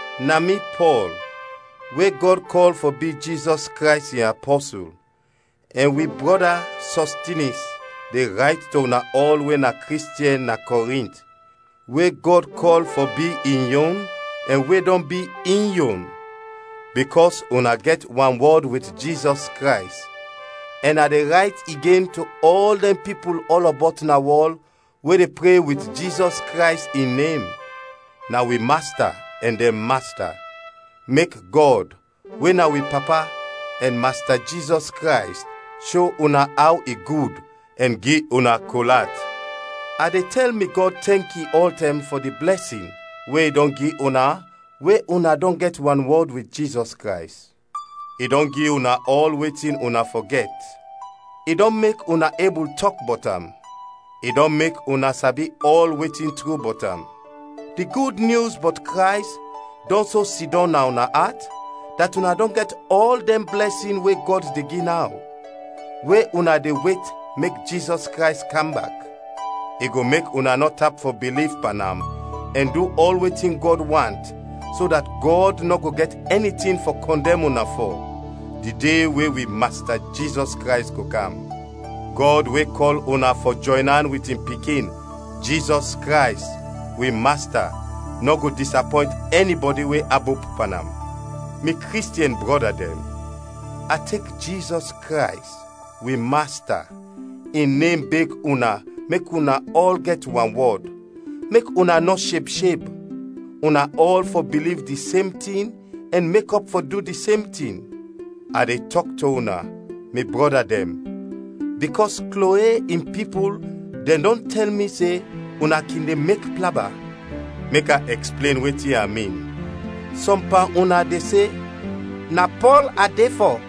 Na mi, Pɔl, we Gɔd kɔl fɔ bi Jizɔs Krays in apɔsul, ɛn wi brɔda Sɔstinis, de rayt to una ɔl we na Kristiɛn na Kɔrint, we Gɔd kɔl fɔ bi in yon ɛn we dɔn bi in yon, bikɔs una gɛt wanwɔd wit Jizɔs Krays, ɛn a de rayt igen to ɔl dɛn pipul ɔlɔbɔt na wɔl we de pre wit Jizɔs Krays in nem. Na wi Masta ɛn dɛn Masta. Mek Gɔd, we na wi Papa, ɛn Masta Jizɔs Krays sho una aw i gud ɛn gi una kol at. A de tɛl mi Gɔd tɛnki ɔltɛm fɔ di blɛsin we i dɔn gi una we una dɔn gɛt wanwɔd wit Jizɔs Krays. I dɔn gi una ɔl wetin una fɔ gɛt; i dɔn mek una ebul tɔk bɔt am; i dɔn mek una sabi ɔl wetin tru bɔt am. Di Gud Nyus bɔt Krays dɔn so sidɔm na una at, dat una dɔn gɛt ɔl dɛn blɛsin we Gɔd de gi naw, we una de wet mek Jizɔs Krays kam bak. I go mek una nɔ tap fɔ biliv pan am ɛn du ɔl wetin Gɔd want so dat Gɔd nɔ go gɛt ɛni tin fɔ kɔndɛm una fɔ, di de we wi Masta Jizɔs Krays go kam. Gɔd we kɔl una fɔ jɔyn an wit in Pikin, Jizɔs Krays, wi Masta, nɔ go disapɔynt ɛnibɔdi we abop pan am. Mi Kristiɛn brɔda dɛn, a tek Jizɔs Krays, wi Masta, in nem, beg una mek una ɔl gɛt wanwɔd, mek una nɔ sheb sheb; una ɔl fɔ biliv di sem tin ɛn mekɔp fɔ du di sem tin. A de tɔk to una, mi brɔda dɛn, bikɔs Kloe in pipul dɛn dɔn tɛl mi se una kin de mek plaba. Mek a ɛksplen wetin a min: sɔm pan una de se, “Na Pɔl a de fɔ;”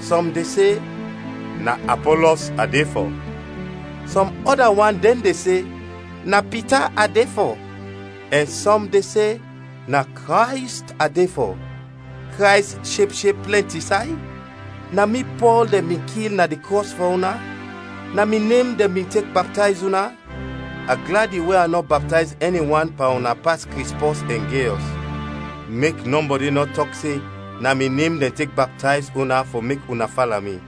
sɔm de se, “Na Apɔlɔs a de fɔ;” sɔm ɔda wan dɛn de se, “Na Pita a de fɔ;” ɛn sɔm de se, “Na Krays a de fɔ.” Krays sheb sheb plɛnti say? Na mi Pɔl dɛn bin kil na di krɔs fɔ una? Na mi nem dɛn bin tek baptayz una? A gladi we a nɔ baptayz ɛni wan pan una pas Krispɔs ɛn Gayɔs. Mek nɔbɔdi nɔ tɔk se na mi nem dɛn tek baptayz una fɔ mek una fala mi.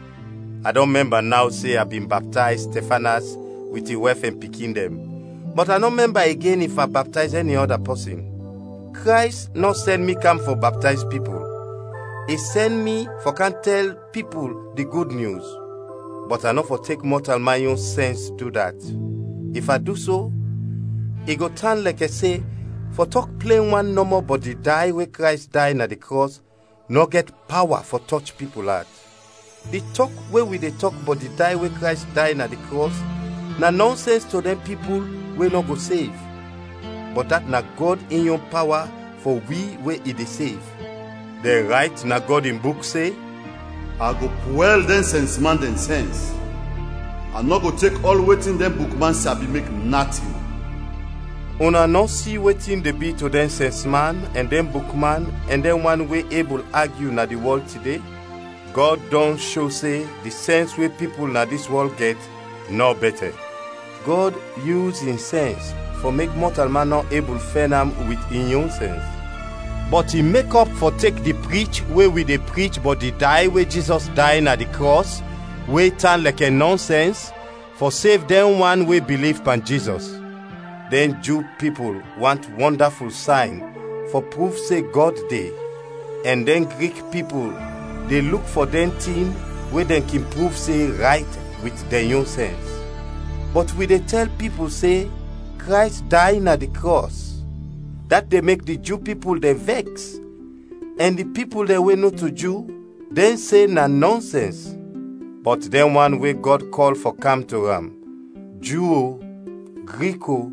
(A dɔn mɛmba naw se a bin baptayz Stɛfanas wit in wɛf ɛn pikin dɛn, bɔt a nɔ mɛmba igen if a baptayz ɛni ɔda pɔsin). Krays nɔ sɛn mi kam fɔ baptayz pipul, i sɛn mi fɔ kam tɛl pipul di Gud Nyus. Bɔt a nɔ fɔ tek mɔtalman yon sɛns du dat; if a du so, i go tan lɛkɛ se fɔ tɔk plen wan nɔmɔ bɔt di day we Krays day na di krɔs nɔ gɛt pawa fɔ tɔch pipul at. Di tɔk we wi de tɔk bɔt di day we Krays day na di krɔs na nɔnsɛns to dɛn pipul we nɔ go sev, bɔt dat na Gɔd in yon pawa fɔ wi we i de sev. Dɛn rayt na Gɔd in Buk se, “A go pwɛl dɛn sɛnsman dɛn sɛns. A nɔ go tek ɔl wetin dɛn bukman sabi mek natin.” Una nɔ si wetin de bi to dɛn sɛnsman, ɛn dɛn bukman ɛn dɛn wan we ebul agyu na di wɔl tide? Gɔd dɔn sho se di sɛns we pipul na dis wɔl gɛt nɔ bɛtɛ. Gɔd yus in sɛns fɔ mek mɔtalman nɔ ebul fɛn am wit in yon sɛns. Bɔt i mekɔp fɔ tek di prich we wi de prich bɔt di day we Jizɔs day na di krɔs we tan lɛkɛ nɔnsɛns, fɔ sev dɛn wan we biliv pan Jizɔs. Dɛn Ju pipul want wɔndaful sayn fɔ pruv se Gɔd de, ɛn dɛn Grik pipul de luk fɔ dɛn tin we dɛn kin pruv se rayt wit dɛn yon sɛns. Bɔt wi de tɛl pipul se Krays day na di krɔs, dat de mek di Ju pipul dɛn vɛks ɛn di pipul dɛn we nɔto Ju dɛn se na nɔnsɛns. Bɔt dɛn wan we Gɔd kɔl fɔ kam to am, Ju o, Grik o,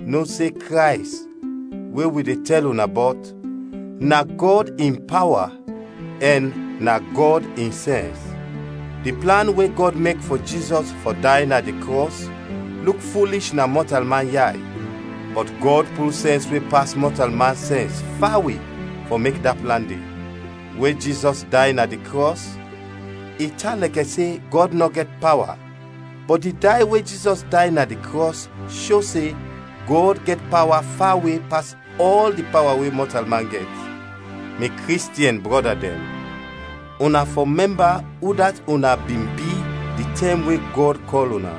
no se Krays, we wi de tɛl una bɔt, na Gɔd in pawa ɛn na Gɔd in sɛns. Di plan we Gɔd mek fɔ Jizɔs fɔ day na di krɔs luk fulish na mɔtalman yay, bɔt Gɔd pul sɛns we pas mɔtalman sɛns fawe fɔ mek da plan de. We Jizɔs day na di krɔs, i tan lɛkɛ se Gɔd nɔ gɛt pawa, bɔt di day we Jizɔs day na di krɔs sho se Gɔd gɛt pawa fawe pas ɔl di pawa we mɔtalman gɛt. Mi Kristiɛn brɔda dɛn, una fɔ mɛmba udat una bin bi di tɛm we Gɔd kɔl una.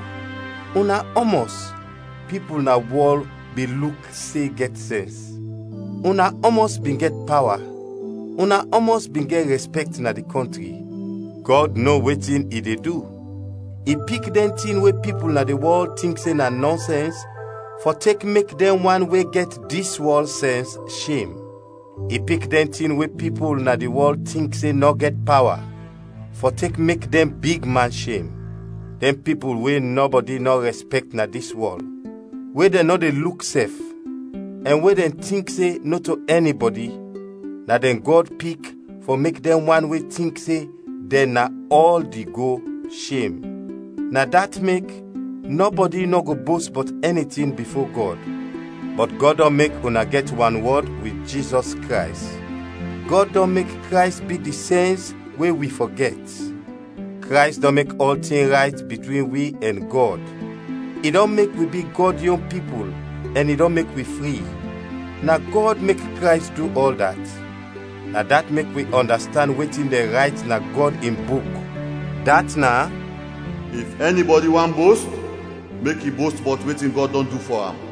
Una ɔmɔs, pipul na wɔl bin luk se gɛt sɛns; una ɔmɔs bin gɛt pawa? Una ɔmɔs bin gɛt rɛspɛkt na di kɔntri? Gɔd no wetin i de du. I pik dɛn tin we pipul na di wɔl tink se na nɔnsɛns fɔ tek mek dɛn wan we gɛt dis wɔl sɛns shem; i pik dɛn tin we pipul na di wɔl tink se nɔ gɛt pawa fɔ tek mek dɛn big man shem. Dɛn pipul we nɔbɔdi nɔ rɛspɛkt na dis wɔl, we dɛn nɔ de luk sɛf, ɛn we dɛn tink se nɔto ɛnibɔdi, na dɛn Gɔd pik fɔ mek dɛn wan we tink se dɛn na ɔl di go, shem. Na dat mek, nɔbɔdi nɔ go bost bɔt ɛni tin bifo Gɔd. Bɔt Gɔd dɔn mek una gɛt wanwɔd wit Jizɔs Krays; Gɔd dɔn mek Krays bi di sɛns we wi fɔ gɛt. Krays dɔn mek ɔltin rayt bitwin wi ɛn Gɔd, i dɔn mek wi bi Gɔd yon pipul ɛn i dɔn mek wi fri; na Gɔd mek Krays du ɔl dat. Na dat mek wi ɔndastand wetin dɛn rayt na Gɔd in Buk, dat is, “If ɛnibɔdi want bost, mek i bost bɔt wetin Gɔd dɔn du fɔ am.”